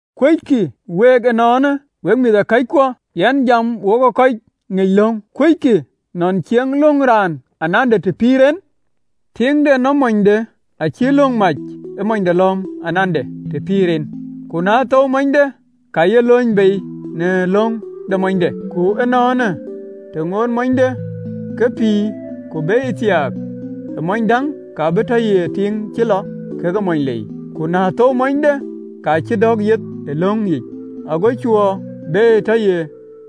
Kuöckï week ënɔɔnë, wek mïthëkɔckuɔ, (yɛn jam wokë kɔc ŋic löŋ), kuöckï nɔn cieŋë löŋ raan anande të pïïr en? Tiiŋ de nɔm monyde acïï löŋ mac ë monyde lɔ̈ɔ̈m anande të pïïr en, ku na thou monyde, ka ye luöny bei në löŋ de monyde. Ku ënɔɔnë, të ŋootë monyde ke pïïr, ku be yë thiaak ë mony däŋ, ka bï tɔ ye tiiŋ cï lɔ kekë mony lei, ku na thou monyde, ka cï dɔ̈k yeth ee löŋë yic, ago cuö be yë tɔ ye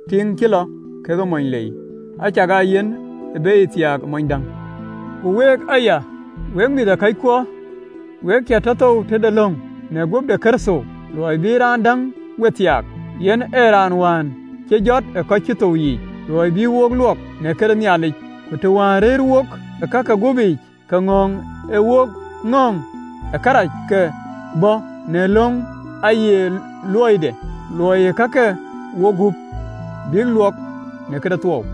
tiiŋ cï lɔ kekë mony lei, acakaa yen ë be yë thiaak ë mony däŋ. Ku week aya, wek mïthëkɔckuɔ, we cï tɔ thou tëde löŋ, në guöp de Kërtho, luɔi bï raan däŋ we thiaak, yen ee raan wään cï jɔt ë kɔc cï thou yiic, luɔi bï wok luɔk në këde Nhialic. Ku të wään rëër wok ë ka ke guöpic, ke ŋɔ̈ɔ̈ŋ ee wok ŋɔ̈ŋ ë kërac, kë ë bɔ̈ në löŋ, aaye luɔide looi ë ka ke wogup, bïk luɔk në këde thuɔɔu.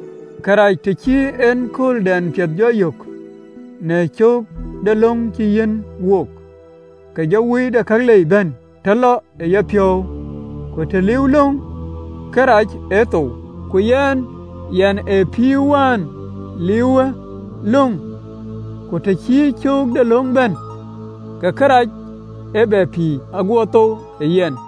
Ku të cï en kööldɛn piɛth jɔ yök, në cöök de löŋ cï yiɛ̈n wook, ke jɔ wui de kalei ëbɛ̈n tɔ lɔ ë yapiɔ̈u, ku të liiuwë löŋ, kërac ee thou. Ku yɛn, yɛn ee pïïr wään liiuwë löŋ, ku të cï cöök de löŋ bɛ̈n, ke kërac ee bɛ pïïr, aguɔ thou yɛn,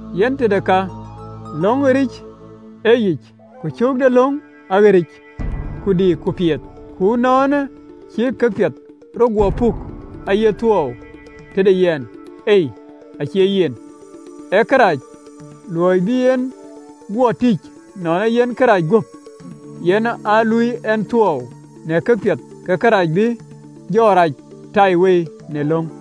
Yen tëde ka, löŋ aɣeric ë yic, ku cöök de löŋ aɣeric, ku diik, ku piɛth. Ënɔɔnë, cï këpiɛth rɔt guɔ puk aye thuɔɔu tëde yɛn? Ei! Acie yen. Ee kërac, luɔi bï en guɔ tïc nɔn ee yen kërac guöp, yen aa luui ɛn thuɔɔu në këpiɛth, ke kërac bï jɔ rac ëtaiwei në löŋ.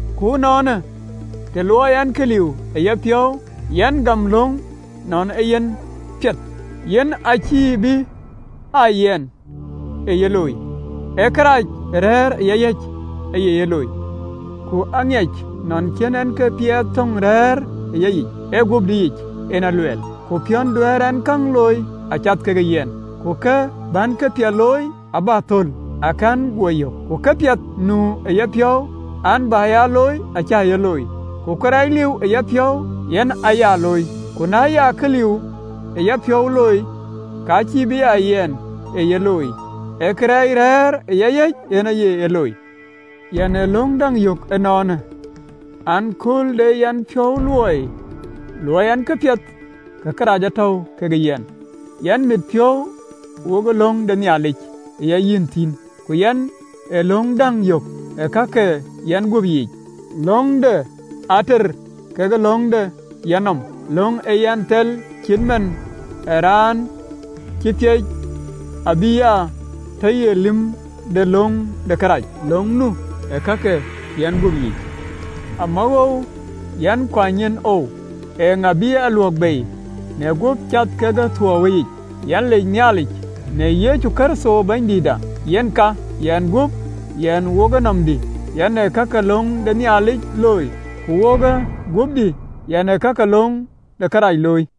Ku ënɔɔnë, të luɔi ɛn kë liu ë yapiɔ̈u, yɛn gam löŋ nɔn ee yen piɛth. Yen acïï bï bɛ a yɛn ee ye looi, ee kërɛɛc rɛ̈ɛ̈r ë yayic, yen aye ye looi. Ku aŋiɛc nɔn cïn en këpiɛth töŋ rɛ̈ɛ̈r ë yayic, (ee guöpdïyic en luɛɛl) ku piɔ̈n duɛ̈ɛ̈r ɛn käŋ looi acath ke yɛn, ku kë bän këpiɛth looi, abä thöl, akɛ̈n guɔ yök. Ku këpiɛth nu ë yapiɔ̈u an, bä ya looi, acä ye looi, ku kërɛɛc liu ë yapiɔ̈u, yen aya looi. Ku na ya kë liu ë yapiɔ̈u looi, ka cïï be aa yɛn ë ye looi, ee kërɛɛc rɛ̈ɛ̈r ë yayic, yen aye ye looi. Yɛn ë löŋ däŋ yök ënɔɔnë an: Kööl dɛ yɛn piɔ̈u luɔi luɔɔi ɛn këpiɛth, ke kërac tɔ̈u kekë yɛn. Yɛn mit piɔ̈u wokë löŋ de Nhialic ë yayic thïn, ku yɛn ë löŋ däŋ yök ë ka ke yɛnguöp yiic, löŋ de ater kekë löŋ de yanɔm, löŋ ë yɛn thel cït man ë raan cï peec abï ya tɔ ye lïm de löŋ de kërac, löŋ nu ë ka ke yɛnguöp yiic. Amawoou yɛn kuany nyin oou! Eeŋa bï a luäk bei në guöp cath ke thuɔɔuwëyic? Yɛn lec Nhialic Yecu Kërtho Bɛ̈nydïïtda. Yen ka, yɛn guöp, yɛn wokë nɔmdï, yɛn ee ka ke löŋ de Nhialic looi, ku wokë guöpdï, yɛn ee ka ke löŋ de kërac looi.